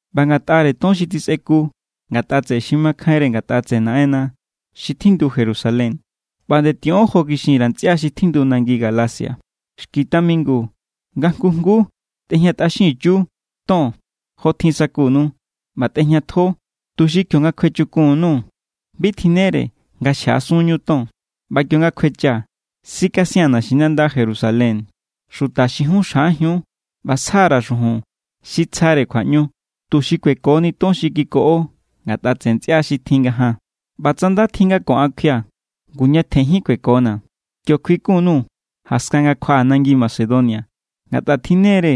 ꞌBa ngatꞌare ton xi tjisꞌeku ngatꞌa tseꞌe xi makjainre ngatꞌa tseꞌe Naꞌenna xi tjindu Jerusalén, ꞌba nde tiꞌon jo kixin_ra̱ ntsꞌia xi tjindu nangi Galacia. Xki tamingu nga jngu jnguu tꞌejñatꞌaxinchiu ton, jotjin sa̱kunu. ꞌBa tꞌejñatjo tuxi kionga kjuechukun_nuu̱ bi tjinnere nga xjaꞌasunñu ton. ꞌBa kionga kjuechaa̱, sikasia̱n naxinanda Jerusalén xuta xi jun xjaꞌajiun ꞌba sja_ra̱ xujun xi tsjare kjuaꞌñu, tuxi kuekoni ton xi kikoꞌo ngatꞌa tseꞌe ntsꞌia xi tjin ngajaan. ꞌBa tsa nda tjin nga ko an kjuia̱, ngu, ñatjen jín kuekona̱. Kio kjuikun_nuu̱ jaskan nga kjuaꞌaa̱ nangi Macedonia, ngatꞌa tjinne=re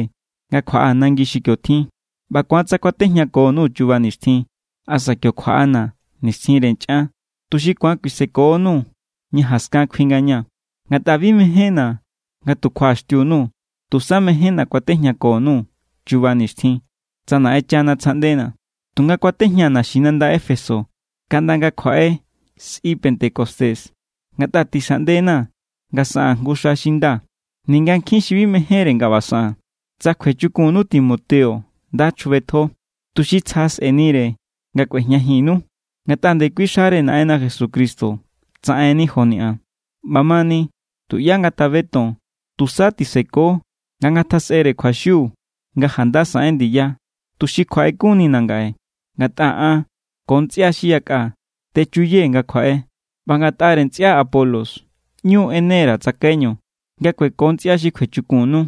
nga kjuaꞌaa̱ nangi xi kio tjin. ꞌBa= ku̱an tsa kuatejñako_nuu̱ chuba nixtjin asa kio kjuaꞌana̱ nixtjinre nchꞌan, tuxi ku̱an kuisekonuu̱ ña jaskan kjui ngaña̱. Ngatꞌa bi mejénna̱ nga tu kjuaꞌaxtiu_nuu̱. Tusa mejénna̱ kuatejñako_nuu̱ chuba nixtjin, tsa Naꞌenchana tsjaꞌndena̱. Tunga kuatejñaa̱ naxinanda Éfeso kaꞌnda nga kjuaꞌe sꞌi pentecostés. Ngatꞌa tixaꞌnde=na̱ nga saꞌaa̱n jngu xa xi nda, ninga nkjin xi bi mejénre nga ꞌba saꞌaa̱n. Tsa kjuechukunnu Timoteo, nda chjubetjo, tuxi tsja sꞌe̱nire nga kꞌuejñajinnu. Ngatꞌa ndekui xare Naꞌenna Jesucristo tsaꞌenni joni an. ꞌBamani, tuꞌyá ngatabeton. Tusa tiseko nga ngatjasꞌere kjuaxiu nga janda saꞌen ndiya, tuxi kjuaꞌekunnina̱ ngaꞌe. Ngatꞌa an ko ntsꞌia xi yakꞌa techuyee̱ nga kjuaꞌe. ꞌBa ngatꞌare ntsꞌia Apolos, ꞌñu= ꞌene_ra̱ tsakaiñu nga kueko ntsꞌia xi kjuechukunnu.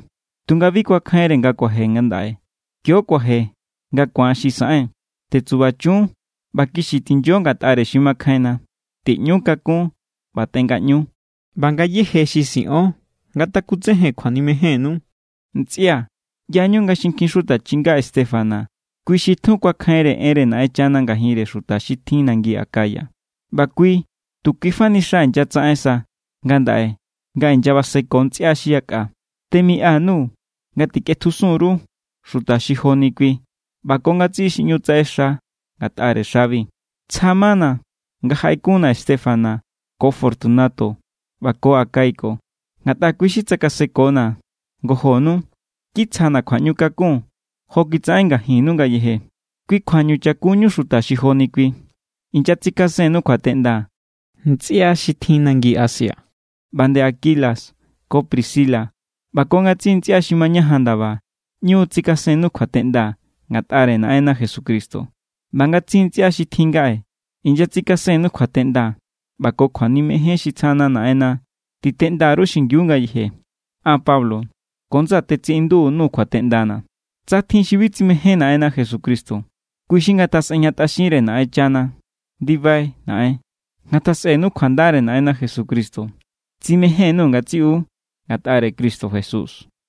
Tunga bi kuakjainre nga kuaje ngandaꞌe. Kio kuaje nga ku̱an xi saꞌen. Tetsubachun ꞌba kixi tinyo ngatꞌare xi makjainna. Tiꞌñu kakún ꞌba tengaꞌñu. ꞌBa ngayéje xi siꞌon ngatakutsejen kjuanimejénnu. Ntsꞌia̱, ꞌyañu nga xinkjin xuta chinga Estéfanas kui xi tjun kuakjainre enre Naꞌenchana ngajinre xuta xi tjin nangi Acaya, ꞌba kui tu kuifa ni xa inyatsaꞌen sa ngandaꞌe nga inyabaseko ntsꞌia xi yakꞌa. Temiꞌa_nuu̱ nga tikꞌetjusun_ru xuta xi joni kui ꞌba ko ngatsiꞌi xi ꞌñu tsaꞌexa ngatꞌare xabi. Tsja= mana̱ nga jaꞌekunna̱ Estéfanas ko Fortunato ꞌba ko Acaico, ngatꞌa kui= xi tsakasekona̱ ngojonu. Kitsjana̱ kjuaꞌñu kakun jo kitsaꞌen ngajinnu ngayeje. Kui kjuañu cha̱kunñu xuta xi joni kui. Inyatsikasen_nuu̱ kjuateꞌnda ntsꞌia xi tjin nangi Asia. ꞌBa nde Aquila ko Priscila ꞌba ko ngatsiꞌi ntsꞌia xi mañajan ndaba ꞌñu tsikasennu kjuateꞌnda ngatꞌare Naꞌenna Jesucristo. ꞌBa ngatsiꞌi ntsꞌia xi tjin ngaꞌe inyatsikasennu kjuateꞌnda. ꞌBa ko kjuanimejen xi tsjana Naꞌenna titeꞌnda_ru xingiu ngayeje. An Pablo ko ndsaa̱ tetsiꞌindu_nuu̱ kjuateꞌndana̱. Tsa tjin xi bi tsimején Naꞌenna Jesucristo, kui xi ngatjasꞌejñatꞌaxinre Naꞌenchana. ¡Ndibai Naꞌen! Ngatjasꞌenu kjuandare Naꞌenna Jesucristo. Tsimején_nuu̱ ngatsiꞌu ngatꞌare Cristo Jesús.